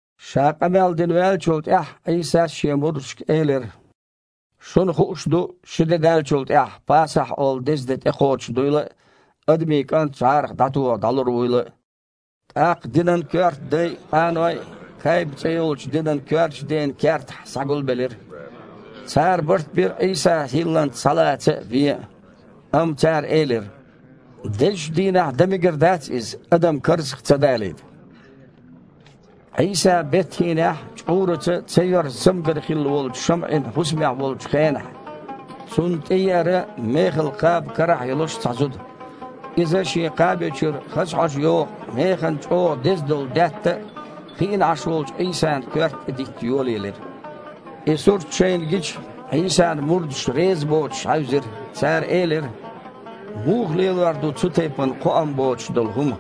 Ша къамел дина ваьллачул тІаьхьа Іийсас Шен мурдашка элира: «Шуна хууш ду ши де даьллачул тІаьхьа „Пасахь“ олу деза де тІекхочуш дуйла а, Адамийн КІант жІарах дІатоха дІалур вуйла а». ТІаккха динан коьрта дай а, къаной а Кайба цІе йолчу динан коьртачу ден кертахь схьагулбелира. Цара барт бира Іийса хІилланца схьалаца а, вен а. Амма цара элира: «Дезачу дийнахь дан мегар дац иза, адам карзах ца далийта». Іийса Бет-ХІинехь чкъураца ца йоьрзу цамгар хилла йолчу ШамІин хІусамехь волчу хенахь, Цунна тІееара, мехала кхаба карахь а йолуш, цхьа зуда. Иза шен кхаби чуьра хаза хьожа йогІу, механа чІогІа деза долу даьтта хиъна Іаш волчу Іийсана коьрта тІе дитта йолаелира. И сурт шайна гича, Іийсан мурдаш резабоцуш хьаьвзира. Цара элира: «Муха лелор ду цу тайпана кхоам боцуш долу хІума?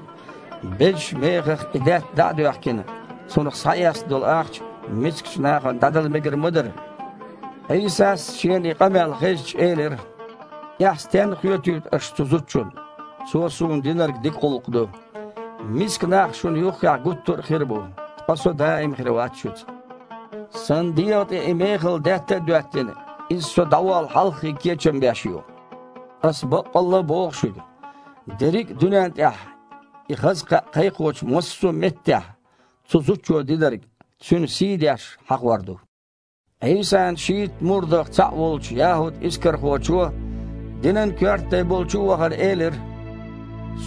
Безачу мехах и даьтта дІа а доьхкина, цунах схьаэцна долу ахча мискачу нахана дІадала мегар ма дара». Іийсас, Шена и къамел хезча, элира: «Эхь стенна хоьтуьйту аша цу зудчунна? Цо Суна динарг дика гІуллакх ду. Миска нах шуна юххехь гуттар а хир бу, ткъа Со даим хир вац шуьца. Сан дегІа тІе и мехала даьтта а доьттина, иза Со дІаволла хьалххе кечам беш ю. Аса баккъалла а боху шуьга: дерриг а дуьнен тІехь, и хаза кхаъ кхайкхочу массо а меттехь, цу зудчо динарг, цуьнан сий айдеш, хьахор ду». Іийсан шийтта мурдах цхьаъ волчу ЯхІуд-Искархочо, динан коьрта дай болчу а вахана, элира: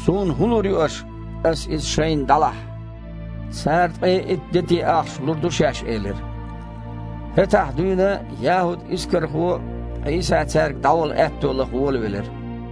«Суна хІун лур ю аша, аса Иза шайна дІалахь?» Цара ткъе итт дети ахча лур ду шаьш элира. ХІеттахь дуьйна ЯхІуд-Искархо Іийса цаьрга дІавала аьтто лаха волавелира.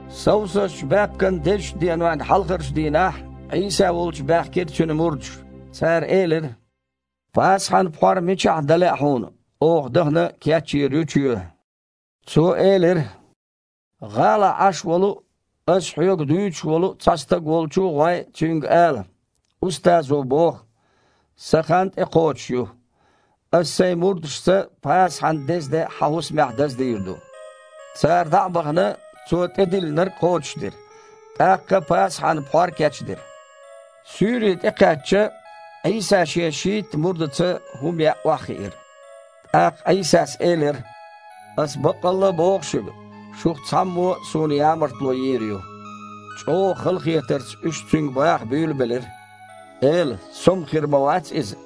Совсазчу баьпкан дезачу денойн хьалхарчу дийнахь Іийса волчу баьхкира Цуьнан мурдаш. Цара элира: «Пасахьан пхьор мичахь дан лаьа Хьуна? Оха, дахана, кечйийр ю чоь». Цо элира: «ГІалахь Іаш волу а, ас хьоьга дуьйцуш волу а стаг волчу а гІой, цуьнга ала: „Устазо боху: (Сан хан тІекхочуш ю. Аса Сайн мурдашца Пасахьан деза де хьан хІусамехь даздийр ду’“». Цара, дІа а бахана, Цо тІедиллинарг кхочушдира, тІаккха Пасахьан пхьор кечдира. Суьйре тІекхаьчча, Іийса Шен шийтта мурдаца хІума яа охьахиира. ТІаккха Іийсас элира: «Аса баккъалла а боху шуьга: шух цхьаммо Суна ямартло йийр ю». ЧІогІа халахетарца уьш Цуьнга баха буьйлабелира: «Эла, со-м хир ма вац иза!»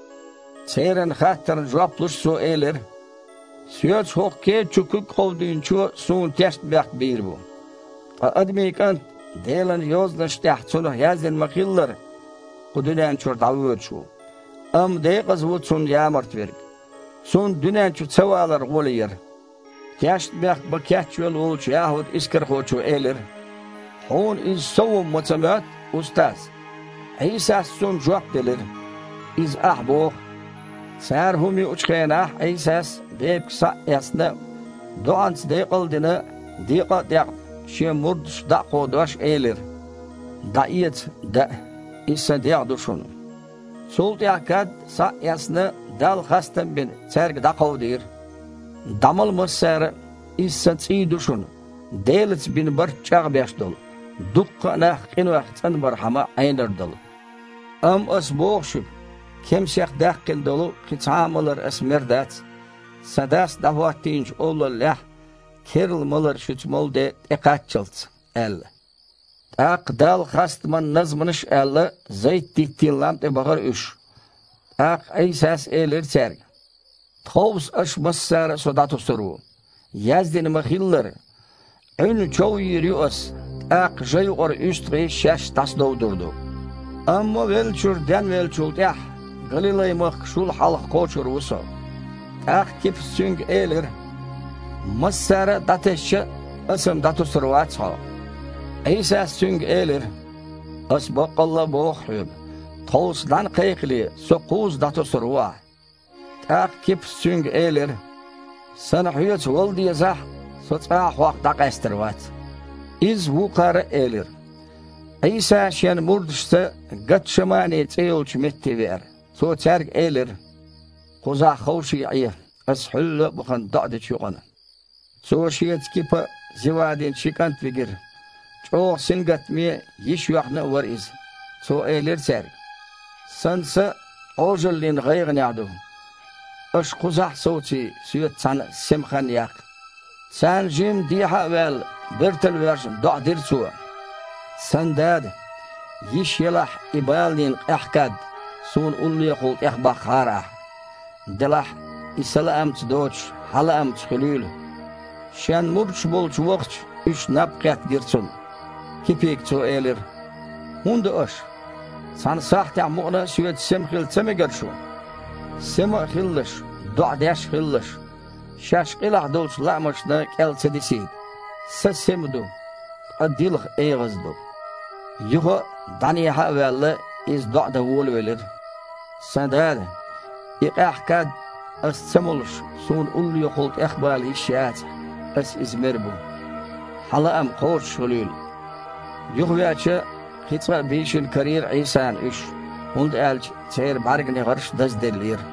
Церан хаттарна жоп луш, Цо элира: «Соьца хІокху кеда чу куьг кховдийначо Суна тешнабехк бийр бу. Ткъа Адамийн КІант, Делан Йозанашна тІехь Цунах яздина ма-хиллара, кху дуьнен чуьра дІавоьдуш ву. Амма декъаза ву Цунна ямарта верг! Цунна дуьнен чу ца валар гІоле яра!» Тешнабехк бан кечвелла волчу ЯхІуд-Искархочо элира: «Хьуна иза со ву-м ма ца моьтту, Устаз!» Іийсас цунна жоп делира: «Иза ахьа боху!» Цара хІума юучу хенахь Іийсас, бепиг схьа а эцна, доІанца декъал а дина, декъа а декъна, Шен мурдашка дІа а кховдош, элира: «ДІаэца, даа, иза Сан дегІ ду шуна!» Цул тІаьхьа кад, схьа а эцна, Далла хастам а бина, цаьрга дІакховдийра: «ДІамала массара а, иза Сан цІий ду шуна, Делаца бина барт чІагІбеш долу, дуккха а нах къинойх цІанбархьама Іенар долу! Амма Аса боху шуьга: кемсех даьккхина долу кхин цхьа а малар Аса мер дац, Сан Дас дІахІоттийначу Олаллехь керла малар шуьца молу де тІекхаччалц», – аьлла. ТІаккха Далла хастаман назманаш а аьлла, Зайт-диттийн лам тІе бахара уьш. ТІаккха Іийсас элира цаьрга: «Тховса аша массара а Со дІатосур ву, яздина ма-хиллара: „Іуьнна чов йийр ю Аса, тІаккха жа юкъара уьстагІий шаьш дІасадовдур ду“. Амма веллачуьра денвеллачул тІаьхьа Галилай-махка шул хьалха кхочур ву Со». ТІаккха Кипас Цуьнга элира: «Массара а дІатесча а, аса-м дІатосур вац Хьо». Іийсас цуьнга элира: «Аса баккъалла а боху хьоьга: тховса нІаьна кхайкхале, Со кхузза дІатосур ву ахь». ТІаккха Кипас Цуьнга элира: «Сан Хьоьца вала дезахь а, со цкъа а Хьох дІакъаьстар вац». Изза вукхара а элира. Іийса Шен мурдашца Гатшамани цІе йолчу метте веара. Цо цаьрга элира: «Кхузахь ховший Іе, Аса, хьуьлла а вахана, доІа дечу юкъана». Цо Шеца Кипа а, Зевадин ши кІант а вигира. ЧІогІа сингаттаме а, йиш йоьхна а вара Иза. Цо элира цаьрга: «Сан са Іожаллин гІайгІанехь ду. Аша кхузахь а совций, Соьца цхьаьна сема хан яккха». Царна жимма дехьа а ваьлла, бертал а воьжна, доІа дира Цо: «Сан Дада! Йиш елахь, и баланийн къаьхьа кад Суна уллохула тІехбаккхахьара Ахь! Делахь а, иза Сан лаамца доцуш, Хьан лаамца хуьлийла». Шен мурдаш болчу тІевахча, уьш наб кхетта гира Цунна. Кипига Цо элира: «ХІун до аша? Цхьана сахьтехь мукъана а Соьца сема хила ца мегара шу? Сема а хилалаш, доІа деш а хилалаш, шаьш къилахь долчу лаамашна кІел ца дисийта. Са сема ду, ткъа дилха эгІаза ду». Юха а, дІанехьа а ваьлла, Иза доІа дан волавелира: «Сан Дада! И къаьхьа кад, Аса ца молуш, Суна уллохула тІехбала йиш яцахь, Аса иза мер бу. Хьан лаам кхочушхуьлийла!» Юхавеача, кхин цкъа бийшина карийра Іийсана уьш, хІунда аьлча церан бІаьрганегІарш дазделлера.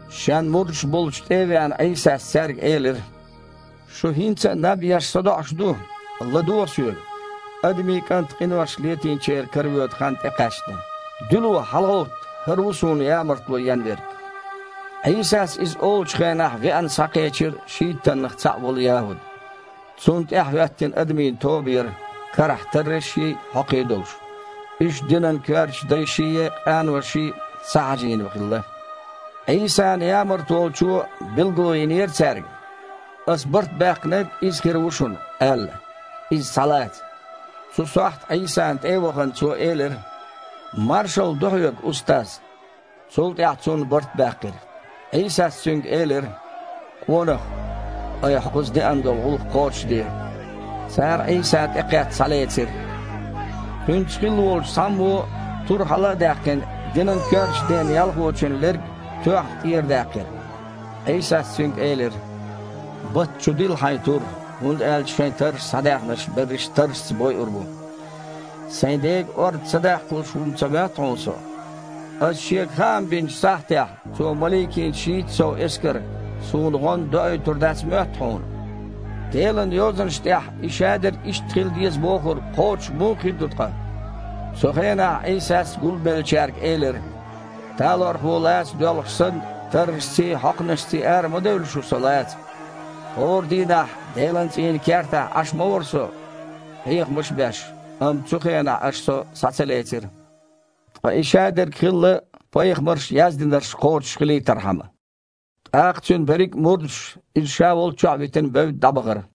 Шен мурдаш болчу тІе а веана, Іийсас цаьрга элира: «Шу хІинца а, наб еш, садоІуш ду? ЛадогІа Соьга: Адамийн КІант къинош летийначеран каравоьду хан тІекхаьчна. Дуьйло, хьалагІовтта! ХІара ву Суна ямартло ен верг». Іийсас иза олучу хенахь веана схьакхечира шийттаннах цхьаъ волу ЯхІуд. Цунна тІаьхьахІоьттина адамийн тоба яра, карахь таррашший, хьокхий а долуш. Уьш динан коьртачу дайший, къаноший схьахьажийна хилла. Іийсана ямарта волчо билгало йинера цаьрга: «Аса барт баьккхинарг Иза хир ву шуна, – аьлла, – Иза схьалаца». Цу сохьта Іийсана тІе а вахана, цо элира: «Маршалла ду Хьоьга, Устаз!» Цул тІаьхьа Цунна барт баьккхира. Іийсас цуьнга элира: «Къонах, айхьа кхуза деана долу гІуллакх кхочушде». Цара Іийса, тІекхетта, схьалецира. Кхуьнца хилла волчу цхьаммо, тур хьала а даьккхина, динан коьртачу ден ялхочун лерг, тоьхна, тІерадаьккхира. Іийсас цуьнга элира: «Батта чу дилла хьайн тур, хІунда аьлча шайн тарраш схьадаьхнарш берриш таррашца бойур бу. Сайн Дега орца ца даккхалуш ву-м ца моьтту хьуна Со? Аса Шега хаам бинчу сахьтехь Цо маликийн шийтта сов эскар Суна гІоьнна доуьйтур дац моьтту хьуна? Делан Йозанаш тІехь и шадерг иштта хила деза бохург кхочуш муха хир ду ткъа?» Цу хенахь Іийсас гулбеллачаьрга элира: «Талорхо лаца доьлхуш санна, таррашций, хьокханашций ара ма девлла шу Со лаца. ХІора дийнахь Делан цІийнан кертахь Іаш ма вара шуна Со, хьехамаш беш, амма цу хенахь аша Со схьа ца лецира. Ткъа и шадерг хилла пайхамарша яздинарш кхочушхилийтархьама». ТІаккха Цуьнан берриг а мурдаш, Иза ша волччохь а витина, бевдда дІабахара.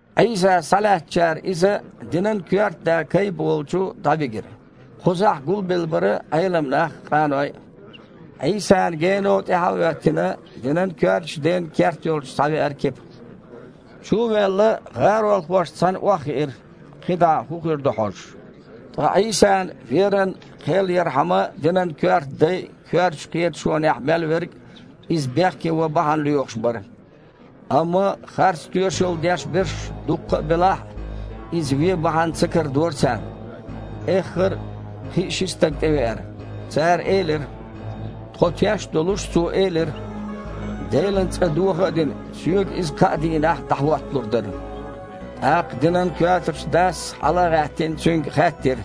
Іийса схьалаьцначара Иза динан коьрта да Кайба волчу дІавигира. Кхузахь гулбелла бара Іелам нах а, къаной а. Іийсана гено тІаьхьа а хІоьттина, динан коьртачу ден керт йолчу схьавеара Кипа. Чу а ваьлла, гІаролхошца цхьаьна охьахиира, кхин дІа хІун хир ду хьожуш. Ткъа Іийсана веран кхел ярхьама, динан коьрта дай а, коьртачу кхеташонехь мел верг а Иза бехке ван бахьана лоьхуш бара. Амма харц тоьшалла деш берш дуккха белахь а, Иза вен бахьана ца карадора царна. Эххар а кхин а ши стаг тІевеара. Цара элира: «Тхо теш а долуш Цо элира: „Делан цІа доха а дина, Соьга иза кхаа дийнахь дІахІотталур дара“». ТІаккха динан коьртачу дас, хьала а гІаьттина, Цуьнга хаьттира: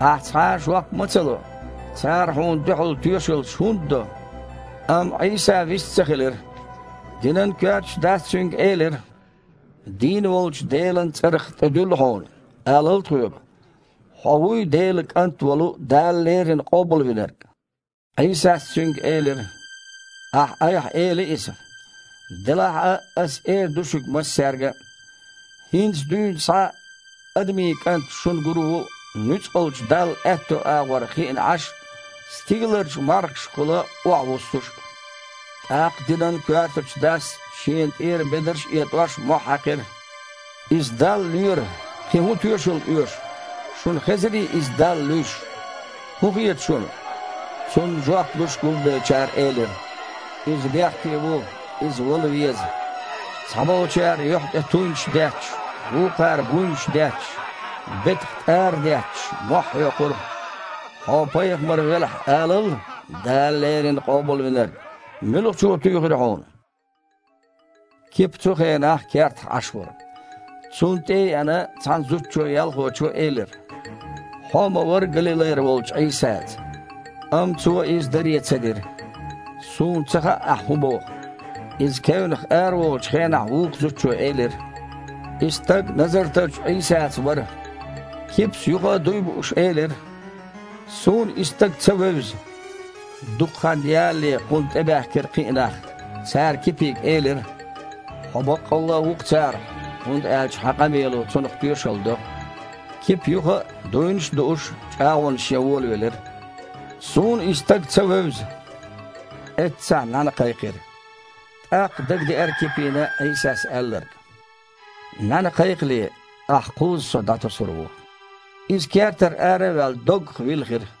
«Ахь цхьа а жоп ма ца ло? Цара Хьуна дуьхьал тоьшаллаш хІунда до?» Амма Іийса вист ца хилира. Динан коьртачу дас Цуьнга элира: «Дийна волчу Делан цІарах тІедуьллу Хьуна: алал тхоьга, Хьо вуй Делан КІант волу Дала леррина Къобалвинарг?» Іийсас цуьнга элира: «Ахьа айхьа эли иза. Делахь а, Аса эр ду шуьга массаьрга: хІинца дуьйна схьа Адамийн КІант шуна гур ву Нуьцкъалчу Далла аьтту агІор хиъна Іаш а, стигаларчу мархашкахула охьавуссуш а». ТІаккха динан коьртачу дас, шена тІера бедарш а этІош, мохь хьаькхира: «Иза Далла лоьра! Кхин хІун тоьшалла оьшу? Шуна хезирий Иза Далла луьйш? ХІун хета шуна?» Цунна жоп луш, гулбеллачара элира: «Иза бехке ву! Иза вала веза!» Цхьаболчара юьхь тІе туйнаш детташ, вукхара буйнаш детташ, бетах тІара детташ, мохь хьоькхура: «Хьо пайхамар велахь, алал, „Дала леррина Къобалвинарг“, муьлхачо туьйхира Хьуна?» Кипа цу хенахь кертахь Іаш вара. Цунна тІе а еана, цхьана зуда-ялхочо элира: «Хьо а ма вара Галилайра волчу Іийсаца». Амма цо иза даре ца дира: «Суна ца хаьа, ахьа хІун боху». Иза кевнах араволучу хенахь вукху зудчо элира: «И стаг Назартарчу Іийсаца вара». Кипас юха а, дуй бууш, элира: «Суна и стаг ца вевза». Дукха хан ялале кхунна тІебаьхкира кхин а нах. Цара Кипига элира: «Хьо баккъалла а ву-кх царах, хІунда аьлча хьан къамело цунах тоьшалла до». Кипа юха а, дуйнаш а дууш, чІагІонаш ян волавелира: «Суна и стаг ца вевза». Эццахь нІаьна кхайкхира. ТІаккха дагадеара Кипина Іийсас аьлларг: «НІаьна кхайкхале, ахьа кхузза Со дІатосур ву». Иза, кертара ара а ваьлла, доггах вилхира.